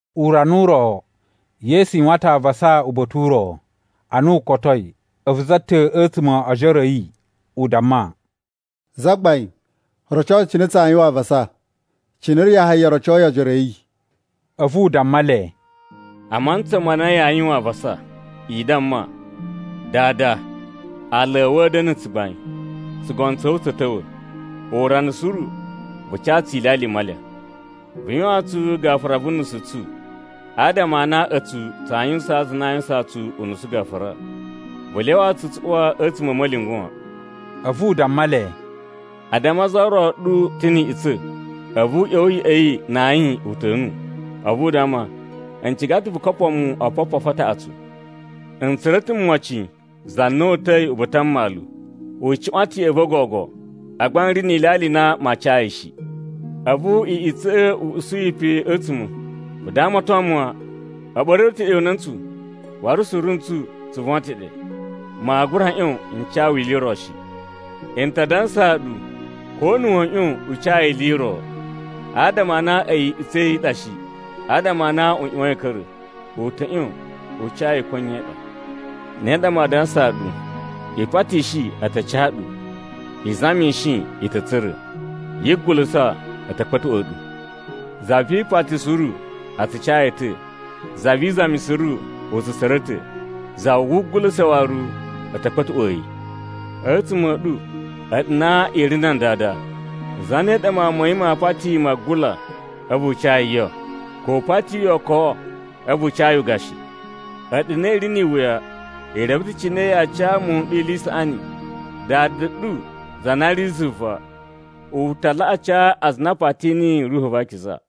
Urana u ro, Yesu yuwan ta̱ avasa uba̱ta̱ u ro. Ana u kotoi, a̱vu za ta̱ a̱tsuma̱ o ojoro a̱ yi, u damma, “Zagbain, roco tsu cine tsaa yuwan avasa, cine Yahaya rocoyi ojoro a̱ yi.” A̱vu u damma le, “A mantsa ma na yaa yuwan avasa, i damma, ‘Dada, aala a̱ wu a̱ da̱na̱ na̱ tsugbain, tsugono tsa̱ wu tsa̱ ta̱wa̱. Urana suru vu ca tsu ilyalya i malya. Vu yuwaan tsu gafura vu unusu u tsu, adama a na a̱tsu tsaa yuwusaan aza a na a yuwusaan tsu unusu gafura. Vu lyawa tsu tsu uwa a̱tsuma̱ a̱ ma̱lyungwa̱ wan.’” A̱vu u damma le, “A damma za ro ɗu ta̱ ni iꞌutsa̱, a̱vu u ꞌya̱wa̱ ya̱ꞌa̱ yi na ayin uta̱nu, a̱vu u damma, ‘N ciga ta̱ vu kopoo mu opopofu a taꞌatsu. N tsura̱ ta̱ mocin za na uta̱i uba̱ta̱ a mmalu, u cuꞌwan ta̱ ya̱ꞌa̱ va̱ gogo, agba n ri ni ilyalya i na maa ca yi shi.’ “A̱vu iꞌutsa̱ꞌa̱ i usu yi pe a̱tsuma̱, ‘Vu damaton mu wan! A̱ ɓa̱ru ta̱ ɗe una̱ntsu, waru suru n tsu, tsu von ta̱ ɗe. Maa gura ꞌyon n ca wu ili i ro shi.’ N ta dansaa ɗu, ko na̱ wa̱a̱ ꞌyon u ca yi ili i ro, adama a na a̱yi iꞌutsa̱ ya̱ yi i ɗa shi, adama a na u ꞌyuwain a̱ ka̱ra̱, u ta̱ ꞌyon u ca yi ko nye i ɗa. “Ne ɗa maa dansaa ɗu, i patishi, a ta ca ɗu. I zamishi, i ta̱ tsura̱. Yi gugulusa, a̱ ta̱ kpa̱tuꞌwa̱a̱ ɗu. Za vi ipati suru, a tsu ca yi ta̱. Za vi izami suru, u tsu tsura̱ ta̱. Za wugulusa waru, a̱ ta̱ kpa̱tuꞌwa̱a̱ yi. “A̱tsuma̱ a̱ ɗu, a̱ɗu na i ri nan dada, zane ɗa mawun ma̱ yi maa pati yi magula, a̱vu u ca yi yo? Ko u pati ookowo, a̱vu u ca yi ugashi? A̱ɗu na i ri ni iwuya, i reve ta̱ cine yaa ca muwun n ɗu ili i saꞌani. Dada ɗu, za na ri zuva, u ta laꞌa ca aza a na a pati niyi Ruhu va Akiza.”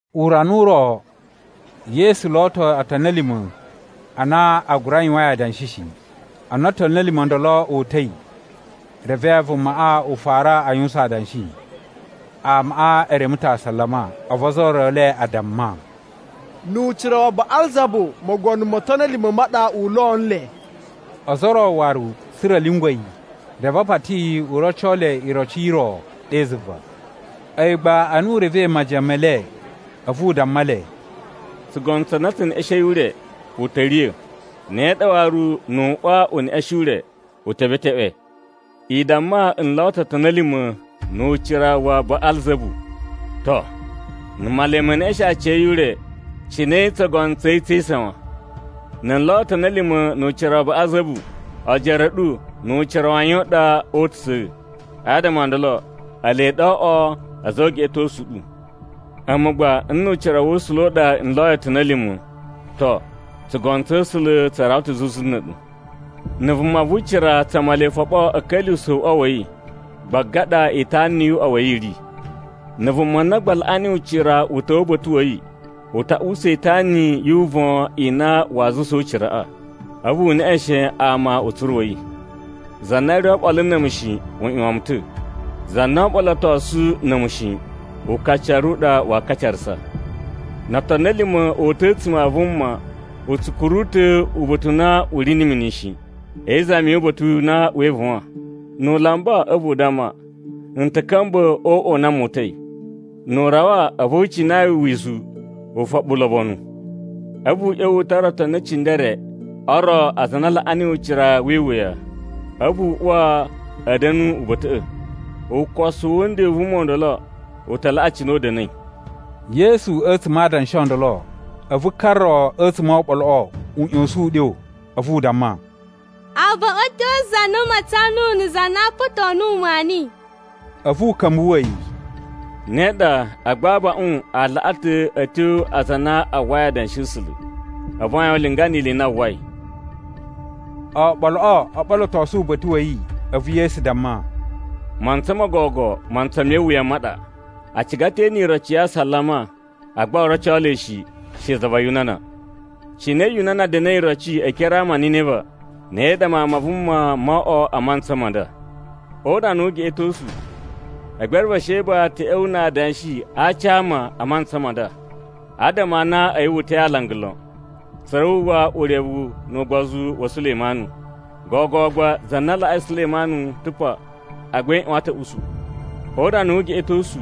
Urana u ro, Yesu lo ta̱ otoni a̱ lima̱ a na a gura yuwain adanshi shi. Ana otoni a̱ lima̱ o ndolo o uta̱i, reve vumaꞌa u fara a yuwusan adanshi. Amaꞌa e reme ta̱ asalama. A̱vu ozo o ro e le a damma, “Nu ucira wa Baꞌalzabu mogono mo otoni a̱ lima̱ ma ɗa u lo nle.” Ozo o ro waru tsa̱ra̱ a̱ lyungwa̱ yi, reve a pati yi u roco le iroci i ro ɗe zuva. A̱yi gba ana u revei majiyan me le, a̱vu u damma le, “Tsugono tsa na tse neꞌeshein ure, u ta̱ riya̱. Ne ɗa waru nu uꞌwa u neꞌeshen ure, u ta̱ beteꞌwe. I damma n lo ta̱ otoni a̱ lima̱ nu ucira wa Baꞌalzabu, to, na̱ Male me neꞌeshen aciya̱yi ure, cine tsugono tsa̱ yi tsee isawan? Na̱ n lo otoni a̱ lima̱ nu ucira wa Baꞌalzabu, ojoro a̱ ɗu nu ucira wa yan u ɗa oo utusa̱? Adama o ndolo, ele ɗa oo oꞌwo a̱za̱ o ugeꞌetosu u ɗu. A̱mu gba nnu ucira wa̱ A̱sula̱ a ɗa n loyi otoni a̱ lima̱, to, tsugono tsa̱ A̱sula̱ tsa rawa ta̱ zuzu na̱ a̱ɗu. “Na̱ vuma vu ucira tsa Male foɓo a̱ ka̱lyuwusa̱ uꞌwa wa̱ yi, gbaga ɗa itana yu uꞌwa wa̱ yi i ri. Na̱ vuma na gba laꞌa niyi ucira u ta̱wa̱ uba̱ta̱ wa̱ yi, u ta usa itana yu uvon i na waa zuwusaa uciraꞌa, a̱vu u neꞌeshen ama utsuru wa̱ yi. “Za na ri oɓolo na̱ a̱mu shi, u ꞌyuwan mu ta̱. Za na oo ɓolotosu na̱ a̱mu shi, ukacaru u ɗa waa kacarasa. “No otoni a̱ lima̱ o uta̱ a̱tsuma̱ a vuma, u tsu kuru ta̱ uba̱ta̱ u na u ri na̱ mini shi, e izami yu uba̱ta̱ u na wee ivuwan. Nu u lamba, a̱vu u damma, ‘N ta̱ ka̱mba̱ o uꞌwa u na mu uta̱i.’ Nu u rawa, a̱vu u cina yi wizu, ufoɓu ulobonu. A̱vu u ꞌya̱wa̱ u tara otoni e cindere o ro aza a na a laꞌa niyi ucira wi iwuya, a̱vu a uwa a̱ da̱nu uba̱ta̱ꞌa̱. Ukosu wu nden n vuma ndolo u ta laꞌa cine u da̱na̱i.” Yesu a̱tsuma̱ adanshi o ndolo, a̱vu ka ro a̱tsuma̱ oɓoloꞌo u ꞌya̱sa̱n uɗyo, a̱vu u damma, “Abaꞌun a̱ tyo a za na matsan nuwu na̱ za na apato nuwu maani.” A̱vu u ka̱mbuwa̱ yi, “Ne ɗa, agba abaꞌun a laꞌa ta̱ a̱ tyo a aza a na a uwwai adanshi a̱ A̱sula̱, a̱vu a yuwan ulinga ni ili i na a uwwai.” Oɓoloꞌo o ɓolotosu uba̱ta̱ wa̱ yi, a̱vu Yesu damma, “Mantsa mo gogo mantsa me iwuya ma ɗa. A ciga ta̱ e ene iroci ya asalama, agba oo roco le shi, she za va Yunana. Cine Yunana da̱na̱i iroci e ekere a ama a Niniva, ne ɗa Mawun ma Vuma moo oꞌwo a mantsa ma nda. O urana wu ugeꞌetosu, Egbere va Sheba ta̱ ꞌya̱wa̱ na adanshi a aci a ama a mantsa ma nda. Adama a na a̱yi wu uta̱i alanga lon, tsa̱ra̱ wu uwwa urevu nu ugbozu wa Sulemanu, gogo gba za na laꞌai Sulemanu ta̱ pa agba i ꞌyuwan ta̱ a̱ usu. O urana wu ugeꞌetosu,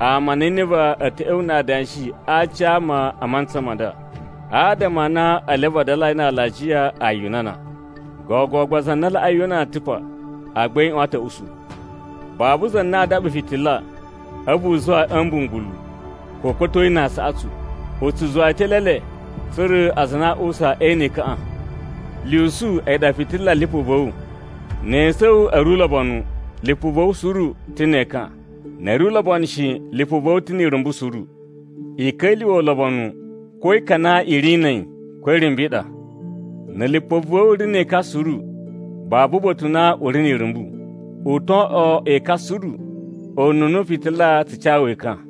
ama a Niniva a̱ ta̱ ꞌya̱wa̱ na adanshi a aci a ama a mantsa ma nda. Adama a na ele a vadalai na alajiya a Yunana. Gogo gba za na laꞌai Yunana ta̱ pa agba i ꞌyuwan ta̱ a̱ usu.” “Babu za na aa daɓa fitila, a̱vu u zuwa yi a̱ mbungulu, ko u kpa̱to yi na aasaꞌatsu. U tsu zuwa yi ta̱ e eelele, tsa̱ra̱ aza a na a uwusa e ene ekaꞌan. Lyusu a̱yi ɗa fitila lipu va̱ wu. Ne esu a̱ wu a̱ ri ulobonu, lipu va̱ wu suru u ta̱ ne ekan. Na̱ a̱ ri ulobonu shi, lipu va̱ wu ta̱ ni irumbu suru. I ka̱lyuwa̱ ulobonu ko ekan a na i ri na̱ a̱yi ko irumbu i ɗa. Na̱ lipu va̱ wu ri ne ekan suru, babu uba̱ta̱ u na u ri ni irumbu, u to oꞌwo ekan suru ununa fitila tsu ca wu ekan.”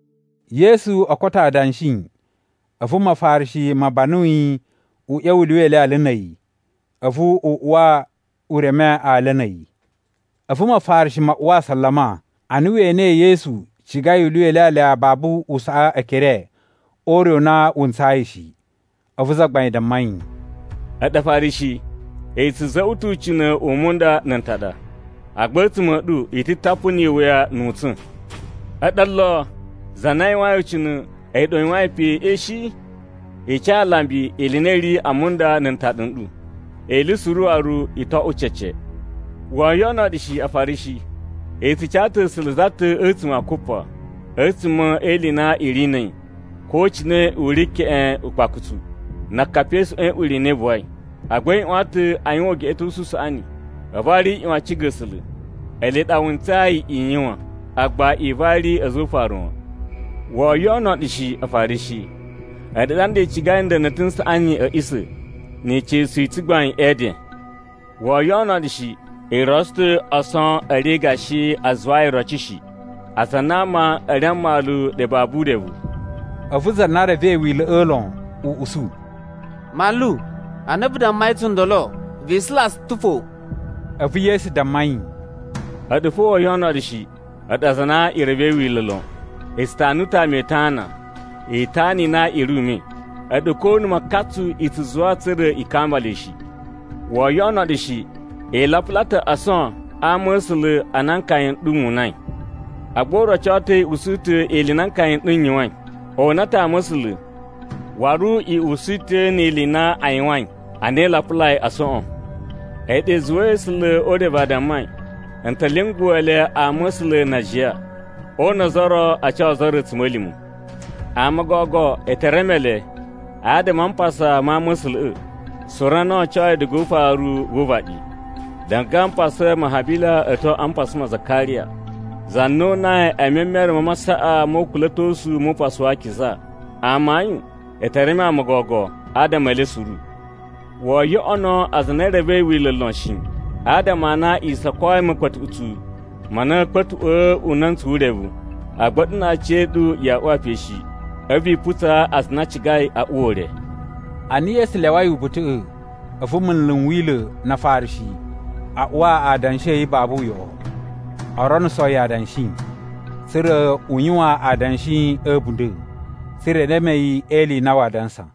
Yesu o koto adanshi, a̱vu Mafarishi ma banu yi u ꞌya̱wa̱ u lyuwa ilyalya na̱ a̱yi. A̱vu u uwa u reme alya na̱ a̱yi. A̱vu Mafarishi ma uwa asalama, ana we enei Yesu cigai u lyuwa ilyalya babu u saꞌa ekere o ure u na wu ntsayi shi. A̱vu Zagbain damma yi, “A̱ɗu Afarishi i tsu za̱za̱ꞌwa̱ ta̱ ucina̱ u munda na̱ ntaɗa, agba a̱tsuma̱ a̱ ɗu i ta̱ tapu ni iwuya nu utsa̱n. A̱ɗu olo! Za na yuwain ucina̱, a̱yi ɗaɗa u yuwain peꞌe shi? I ca alambi ili i na i ri a munda na̱ ntaɗa n ɗu, ili suru waru i to oꞌwo cece. “Woo yoꞌono ɗu shi, Afarishi! I tsu ca ta̱ A̱sula̱ za ta̱ a̱tsuma̱ a kupa, a̱tsuma̱ e ili i na i ri na̱ a̱yi ko cine u ri keꞌen akpakusu, na akapi e isuꞌwan i na i buwai. Agba i ꞌyuwan ta̱ a yuwan ugeꞌetosu u saꞌani, a̱vu waru i ꞌyuwan a ciga A̱sula̱. Ele ɗa wu ntsayi i yuwan, agba i vari a̱za̱ o ufaru wan. “Woo yoꞌono ɗu shi, Afarishi! A̱ɗu ɗa nda i cigai nda̱na̱ta̱ n saꞌani a̱ a̱ꞌisa̱ ni ica̱su i tsugbain e eden. “Woo yoꞌono ɗu shi, i rotso ta̱ ason a̱ ri gashi a zuwayi iroci shi, aza a na ama a̱ ri a mmalu ɗe babu urevu.” A̱vu za na revei Wila̱ꞌa̱ lon u usu, “Manlu ana vu dammai tsundolo, vi isula tsu ta̱ fo.” A̱vu Yesu damma yi, “A̱ɗu fo woo yoꞌono ɗu shi, a̱ɗu aza a na e revei Wila̱ lon! I tsu tanu ta̱ ama itana, itana i na i ri ume, a̱ɗu ko na̱ makatsu i tsu zuwa tsa̱ra̱ i kamba le shi! “Woo yoꞌono ɗu shi! I lapula ta̱ ason a ama̱sula̱ a na nkaya n ɗu mu unai. Agba u roco ta̱ i usu ta̱ ili i na nkaya n ɗu n yuwain. O una ta̱ ama̱sula̱ waru i usu ta̱ ni ili i na a yuwain ana i lapulai asoꞌon. A̱yi ɗa i zuwai A̱sula̱ o urevu a dammai, ‘N ta̱ lyunguwa̱ le ama̱sula̱ na ajiya, o una ozo o ro, a ca ozo o ro a̱tsuma̱lima̱.’ Ama o gogo e te reme le adama a mpasa ma ama̱sula̱ꞌa̱ suru a na o ocoi diga ufaru wu uvaɗi, diga a mpasa ma Habila a̱ tyo a mpasa ma Zakariya, za na o unai e memere ma masaꞌa mo ukula̱tosu nu Upasu wa Akiza. Amayun, e te reme ama o gogo adama e le suru. “Woo yoꞌono aza a na e revei Wila̱ lon shi, adama a na i sokoi ma̱kpa̱tuꞌutsu ma na a̱a̱ kpa̱tuꞌwa̱ una̱ntsu wu urevu, agba a̱ɗu na aciya̱ɗu yaa uwa pe shi, a̱vu i putsaa aza a na a cigai a uwa ure.” Ana Yesu lyawai uba̱ta̱ꞌa̱, a̱vu munlu n Wila̱ na Afarishi a uwa adanshi a̱ yi babu uyoꞌo, o ronuso yi adanshi, tsa̱ra̱ u yuwan adanshi a̱ a̱bunda̱, tsa̱ra̱ e reme yi e ili i na waa dansa.